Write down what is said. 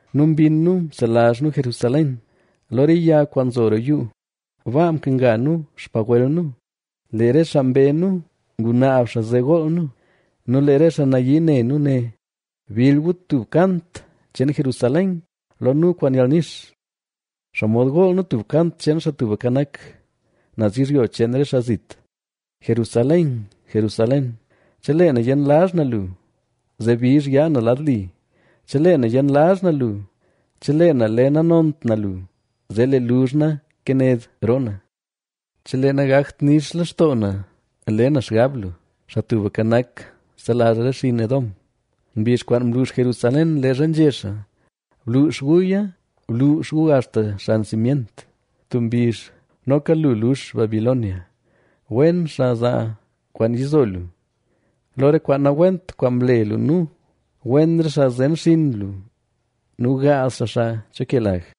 nu mbinn nu mselazh nu Jerusalén. Lo re yag kwaan nzo roo yuu, baa mkenga nu xpagwel nu. Lee re xaa mbe nu ngunaab xaa zee gool nu; nu lee re xaa nayii ne nu né: “Bill gu tub kant cheen Jerusalén lo nu kwaan yalnix.” ¿Xomod gool nu tub kant cheen Xaa Tubka Nak, naz yizhyo cheen re xaa zit? Jerusalén, Jerusalén, chelee na yenlazh na lu, zee bizh yaa na lad li. Chelee na yenlazh na lu, chelee na le nanont na lu, zee lee luzh na kaned roo na; chelee nagakt nix lextoo na le na xgab lu. Xaa Tubka Nak, selazh re xinn Edom, mbizh kwaan mlux Jerusalén leezha nzhé xaa: “Bluux guya, bluux gu axta xan simyent.” Tub mbizh, noka lu lux Babilonia, wen xaa zaa kwaan yizo lu, lo re kwaan nawent kwaan mle lu nu. Wen re xaa zen xinn lu nu gaaz xaa xaa cho ke lag.